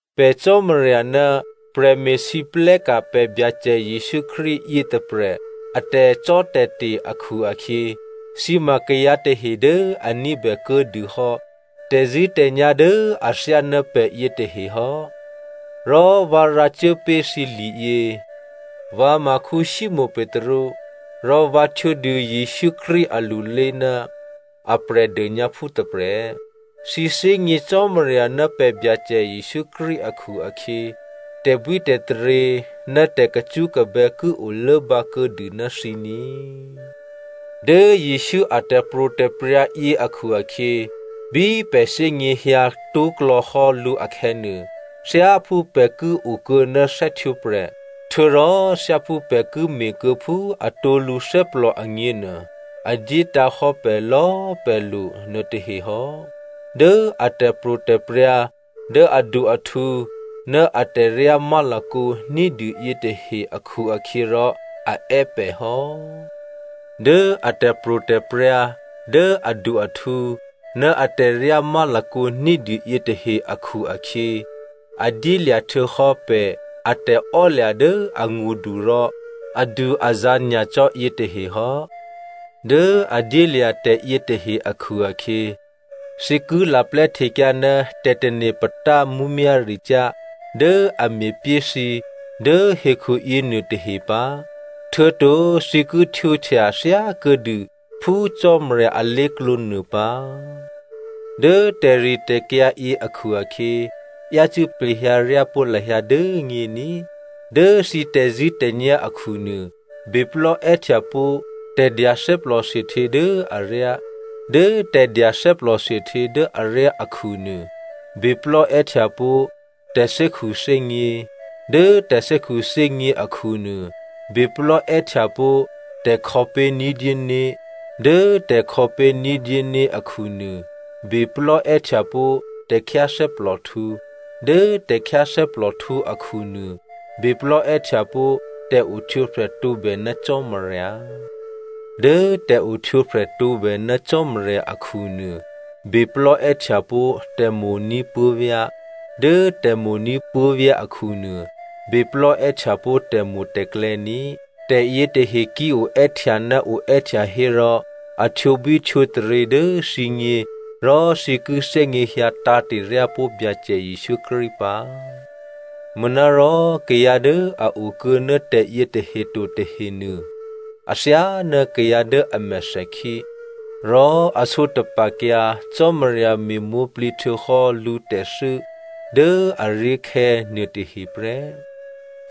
Pè̤ Cò́marya ná prè̤me̤lwóhteka̤ pè̤ Byacè Jesǔ Krístu yětôprè̤ a tè̤cò́tè̤te̤ akhu-akhyě, thǐ ma kayǎ tahe dố a ní̤bè kuô̌dûhò́ tè̤zṳ̂́tè̤nyá̤ dố athyáná pè̤ yětahe hò́. Rò vǎ rǎcuốpé̤ thǐ liyě. Vǎ ma Simonè Petru, rò vǎ htwǒdû Jesǔ Krístu alulé ná a Prè̤dônyǎphú tôprè̤. Thǐ thè́gně Cò́marya ná pè̤ Byacè Jesǔ Krístu akhu-akhyě, tè̤bwítè̤taryě ná tè̤kacṳ́kabè́ ki olốbǎ kuô̌dû ná thǐ ní꤮. Dố Jesǔ a tè̤pro̤tè̤prya̤ yě akhu-akhyě, bí pè̤ thè́gněhyǎ tó̤klò̌hò́ lǔ akhè̌nuô, thyáphú pè̤ ki okuô̌ ná thè́htwǒprè̤, htuô̌rò thyáphú pè̤ ki me̤kuô̌phú atǒ lǔthè́plò agněnuô, a dyétǎ̤hò́ pè̤ lò̌꤮ pè̤ lo nuôtahe hò́. Dố a tè̤pro̤tè̤prya̤ dố adu-ahtǔ ná atè̤ryá má̤lakǒ ní̤dû yětahe akhu-akhyěrò a è́ pè̤ hò́. Dố a tè̤pro̤tè̤prya̤ dố adu-ahtǔ ná atè̤ryá má̤lakǒ ní̤dû yětahe akhu-akhyě, a dyélya̤ htuô̌hò́ pè̤ a tè̤ò́lya̤ dố angṳdu rò adu-azǎ̤ nyacò́ yětahe hò́. Dố a dyélya̤ tè̤yětahe akhu-akhyě, thǐ ki laplè́htekyǎ ná tè̤tane̤ patá mǔmyá̤ricyá̤ dố a me̤pyé thǐ dố hekhu yěnuôtahe pǎ, htuô̌to thǐ ki htwǒhtya thyákuô̌dû phú Cò́marya alé̤klǒ nuô pǎ. Dố tè̤ritè̤kyǎ yě akhu-akhyě, yácû́ plehyǎ ryápó̤ lahyǎ dố nyě ní꤮. Dố thǐ tè̤zṳ̂́tè̤nyá̤ akhunuô, beplò́ è́htyapó̤ tè̤dya thè́plòthuôhtyě dố aryá, dố tè̤dya thè́plò thuôhtyě dố aryá akhunuô, beplò́ è́htyapó̤ tè̤thè́khuthè́gně, dố tè̤thè́khuthè́gně akhunuô, beplò́ è́htyapó̤ tè̤khò̌pé̤ ní̤dyé né̤, dố tè̤khò̌pé̤ ní̤dyé né̤ akhunuô, beplò́ è́htyapó̤ tè̤khyáthè́plòhtǔ, dố tè̤khyáthè́plòhtǔ akhunuô, beplò́ è́htyapó̤ tè̤ohtwǒprè̤ tǒbè ná Cò́marya, dố tè̤ohtwǒprè̤ tǒbè ná Cò́marya akhunuô, beplò́ è́htyapó̤ tè̤mo̤ní̤ puố̤vyá̤, dố tè̤mo̤ní̤ puố̤vyá̤ akhunuô, beplò́ è́htyapó̤ tè̤mo̤tè̤klè̌ ní꤮. Tè̤yětahe ki oè́htya ná oè́htya hérò, a htwǒbwí htwǒtaryě dố thǐgně rò thǐ ki thè́gněhyǎ tǎ̤te̤ryápó̤ Byacè Jesǔ Krístu pǎ. Manárò kayǎ dố a okuô̌ ná tè̤yětahe to tahenuô, athyáná kayǎ dố a mèthèkhí. Rò a sǒtapa̤kyǎ Cò́marya me̤mwǒ̤plǐ htuô̌hò́ lǔtè̤thû́ dố aré̤khè̌ nuôtahe prè́.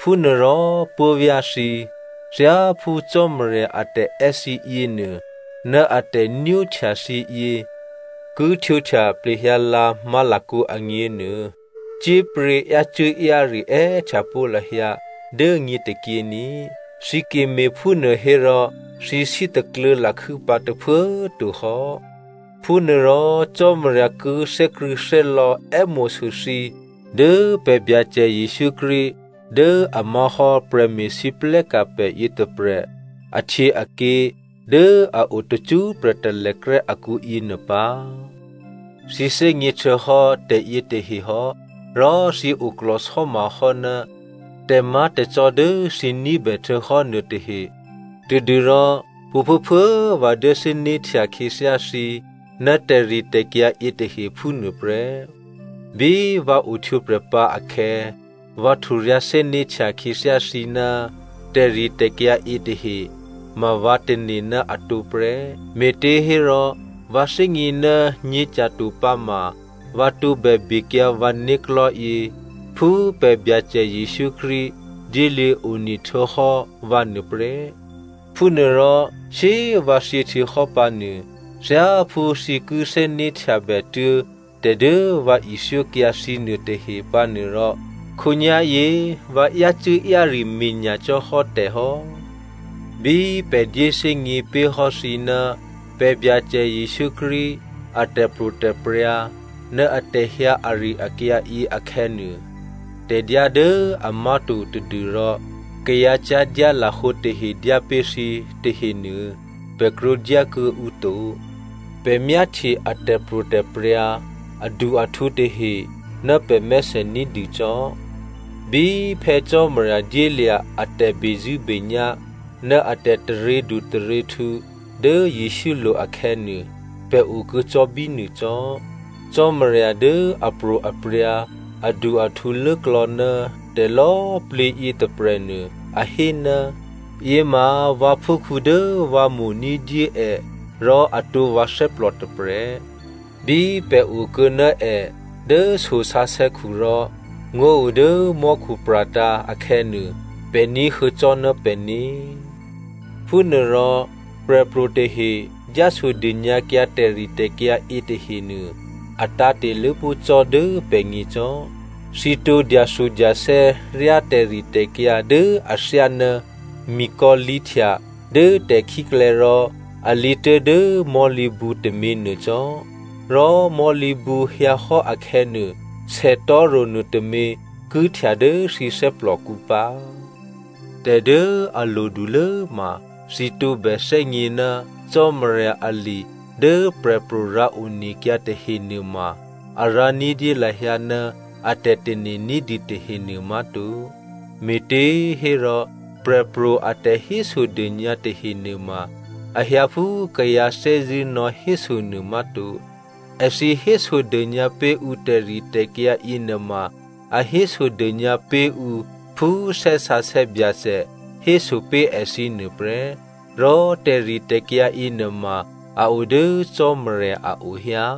Phúnuôrò puố̤vyá̤ thǐ꤮, thyáphú Cò́marya atè̤è́ thǐ yěnuô ná a tè̤nwóhtya thǐ yě ki htwǒhtya plehyǎlǎ má̤lakǒ agněnuô, cyé̤pryě̤ yácû́-yáre è́htyapó̤ lahyǎ dố nyě tôkyě ní꤮. Thǐ ki me̤phúnuô hérò thǐ sítakluô̌ lakhû́ pǎ tôphuố꤮ to hò́. Phúnuôrò Cò́marya ki thè́krṳ̂̌thè́lò̌ è́mo̤sû thǐ dố pè̤ Byacè Jesǔ Krístu dố a má̤hò́ prè̤me̤lwóhteka̤ pè̤ yětôprè̤ ahtyěaké̤ dố a o tacṳ́prè̤ talèkrè́ akǔ yěnuô pǎ. Thǐ thè́gně htuô̌hò́ tè̤yětahe hò́ rò thǐ oklò̤sò́ma hò́ ná tè̤má̤tè̤cò́ dố thǐ ní̤bè htuô̌hò́ nuôtahe tadû́rò pwǒ̤phuốphuố꤮ vǎ dyé thè́né̤htya khyěthyá thǐ ná tè̤ritè̤kyǎ yětahe phúnuô prè́. Bí vǎ ohtwǒprè̤pǎ akhè̌, vǎ hturyǎ̤ thè́né̤htya khyěthyá thǐ ná tè̤ritè̤kyǎ yětahe ma vǎ tane̤ ná atǒ prè́. Me̤těhérò vǎ thè́gně ná nyě̤tyato pǎma, vǎ tǒbè bekyǎ vǎ né̤klò̤́yě phú pè̤ Byacè Jesǔ Krístu dyéluô̌ one htuô̌hò́ vǎ nuô prè́. Phúnuôrò shyé꤮ vǎ thyěhtuô̌hò́ pǎnuô, thyáphú thǐ ki thè́né̤htyabètuố̤ tè̤dố vǎ ithyókyǎ thǐ nuôtahe pǎnuôrò khǒnyá̤yě vǎ yácû́-yáre me̤ nyacò́ hò́ tè̤ hò́. Bí pè̤ dyéthè́gně pé̤ hò́ thǐ ná pè̤ Byacè Jesǔ Krístu a tè̤pro̤tè̤prya̤ ná atè̤hyǎ ari-akyǎ yě akhè̌nuô, tè̤dyá dố amá̤to tadû́rò kayǎ cyá̤dyá lahǒ tahe dyápé̤ thǐ tahenuô, pè̤ krwǒdyá kuô̌ǔ to. Pè̤ myáhtye a tè̤pro̤tè̤prya̤ adu-ahtǔ tahe ná pè̤mèthè ní̤dû cò́. Bí Phè̌ Cò́marya dyélya̤ a tè̤bezṳ̂́benyá̤ ná a tè̤taryědu taryěhtǔ dố Jesǔlo̤ akhè̌nuô, pè̤ okuô̌ cò́ bínuô cò́. Cò́marya dố apro̤aprya̤ adu-ahtǔlốklò̌ ná tè̤lò̌꤮ plǐ yětôprè̤nuô, a hé, “Yěma vǎphúkhǔ dố vǎ mo̤ ní̤dyé è rò atǒ vǎ thè́plò tôprè̤.” Bí pè̤ okuô̌ ná è dố so sǎsè̌khu rò ngó̤ o dố mò́khu pra̤tǎ̤ akhè̌nuô, pè̤ ní̤huô̌cò́ ná pè̤né̤. Phúnuôrò prè̤pro̤ tahe dyásodônyǎkyǎ tè̤ritè̤kyǎ yětahenuô, a tǎ̤te̤ lốpó̤ cò́ dố pè̤gně cò́. Thǐ tǒ dyathudyathè́ ryá tè̤ritè̤kyǎ dố athyáná mikò̌ lǐhtya dố tè̤khíklè̌ rò alǐ tuố̤dố mò̤́lǐbǔ tôměnuô cò́. Rò mò̤́lǐbǔ hyǎ hò́ akhè̌nuô, sètò̤́ro̤ nuôtômě ki htya dố thǐ thè́plòkǔ pǎ. Tè̤ dố a lodulố ma, thǐ tǒbè thè́gně ná Cò́marya ali dố prè̤pro̤ rǎonekyǎ tahenuôma, a rǎ ní̤dyé lahyǎ ná a tè̤tane̤ ní̤dû tahenuô má̤to. Me̤těhérò, prè̤pro̤ a tè̤hésodônyǎ tahe nuôma, a hyǎ phú kayǎ thè́zṳ̂́ nò̌héso nuô má̤to. Èthǐ hésodônyǎ pé̤ ǔ tè̤ritè̤kyǎ yěnuôma a hésodônyǎ pé̤ ǔ phú Thè́ Sǎsè̌ Byacè héso pé̤ èthǐ nuôprè́, rò tè̤ritè̤kyǎ yěnuôma a o dố Cò́marya a o hyǎ.